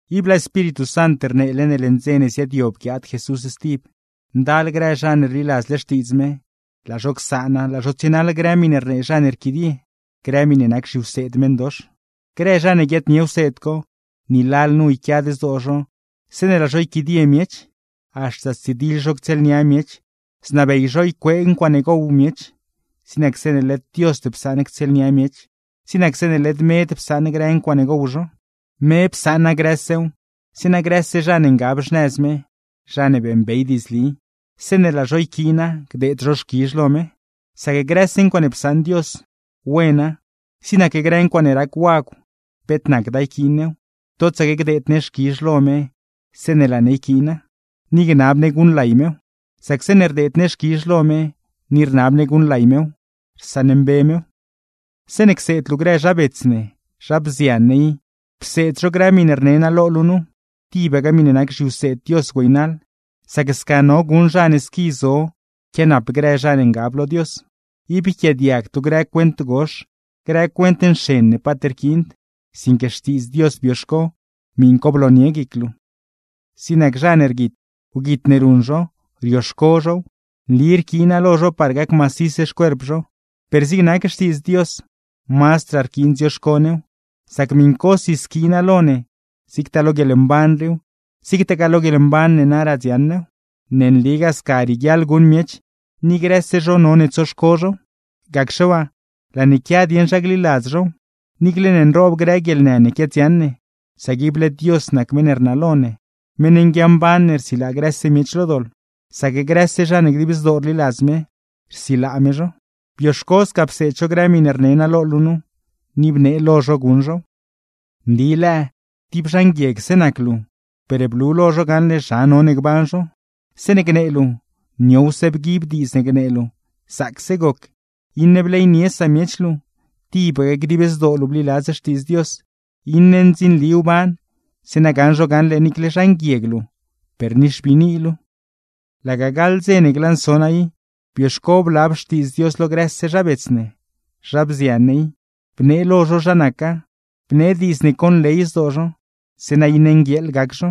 Ib laa Espíritu Sant rneele ne leṉ dze ne ziaadyob guiaad Jesús stib, ndal grë zha ne rliladzle Xtiidz me, laa zho csaana laa zho tsienaḻ grë miṉe rnee zha ne rquidie, grë miṉe nac zhiwseed meṉdox. Grë zha ne guiaadnie wseed co, ni lalnu yquiad zdoo zho zeeṉe laa zho yquidie miech. Haxta stsidiḻ zho ctsieelnia miech, znabey zho ycuee ncuaaṉe gow miech; zig nac zeeṉe led Diosd psaṉ ctsieelnia miech, zig nac zeeṉe led med psaṉ grë ncuaaṉe gow zho. Me psaṉa grësew, zeeṉa grëse zha ne ngab xnëz me (zha ne beeṉbey diidzli), zeeṉe laa zho yquiina gdeed zho xquizh lo me. Sac grëse ncuaaṉe psaṉ Dios, wena; zig nac grë ncuaaṉe rac wagw, peet nacda yquiin new, totsaque gdeed ne xquizh lo me zeeṉe laa ne yquiina, ni gnab ne guṉlay mew; sac zeeṉe rdeed ne xquizh lo me ni rnab ne guṉlay mew, rsaṉmbe mew. Zeeṉe cseed luu grë zha bets ne, zha bzian ne i, pseed zho grë miṉe rne naa lo luu nu, tibaque miṉe nac zhiwseed Dios güeynaḻ; sac sca no guṉ zha ne squi zo quianap grë zha ne ngab lo Dios. Ib yquiaadiagd luu grë cuent gox, grë cuent nxen ne paat rquiind; sinque Xtiidz Dios bioxco, miṉ co bloonie guic luu. Gzoob ne zha ne rguit, wguit ne ruṉ zho, nli rquiina lo zho par gac macis xcuerp zho; per zig nac Xtiidz Dios, mazdraa rquiin dzioxco new; sac miṉcosi squiina lo ne zigtaa lo guieḻmban riiw, zigtagaa lo guieḻmban ne naraa dziaṉ new. ¡Ne nligaa sca rieguiaḻ guṉ miech, ni grëse zho none tsoxco zhow! Ni gacxe waa, laa ne quia dieṉ zha gliladz zhow, niicle ne nroob grë guieḻnë ne quiadziaṉ ne; sac ible Dios nac meṉ ne rnalo ne, meṉ nguiamban ne rsilaa grëse miech lo doḻ; sac grëse zha ne dib zdoo rliladz me, rsilaa me zho. Bioxco sca pseed zho grë miṉe rne naa lo luu nu, ni bnee lo zho guṉ zhow. Nli lëë tib zha nguiegse nac luu, per blu lo zho gaṉle zha none gban zho: Zeeṉe gnee luu, niowse bguib diidz ne gnee luu, zaacse goc, iṉe bleynie samiech luu, tibaque dib zdoo luu bliladz Xtiidz Dios, iṉe ndzinli wban; zeeṉa gaṉ zho gaṉle niicle ne zha nguieg luu, per nixbiini luu. Laga gaḻ dze ne glanso naa i, bioxco blab Xtiidz Dios lo grëse zha bets ne, zha bzian ne i, bnee lo zho zha naca, bnee diidz ne conley zdoo zho; zeeṉa iṉe nguieeḻ gac zho.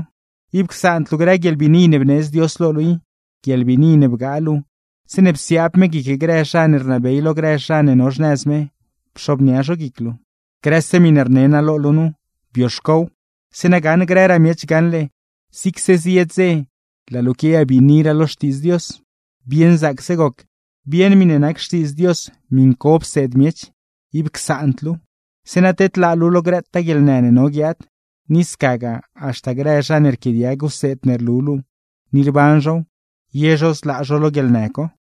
Ib csaand luu grë guieḻbiini ne bneedz Dios lo luu i (guieḻbiini ne bgaa luu zeeṉe psiaab me guic grë zha ne rnabey lo grë zha ne no xnëz me, pxobnia zho guic luu). Grëse miṉe rne naa lo luu nu, bioxcow; zeeṉa gaṉ grëraa miech gaṉle zigse zie dze laa luu quiayabiiniraa lo Xtiidz Dios. Bieṉ zaacse goc, bieṉ miṉe nac Xtiidz Dios, miṉ co pseed miech, ib csaand luuw; zeeṉa tedlaa luu lo grëtaa guieḻnë ne no guiaad, ni scagaa haxta grë zha ne rquiaadiag wseed ne rlu luu ni rban zhow, ye zho zlaa zho lo guieḻnë co.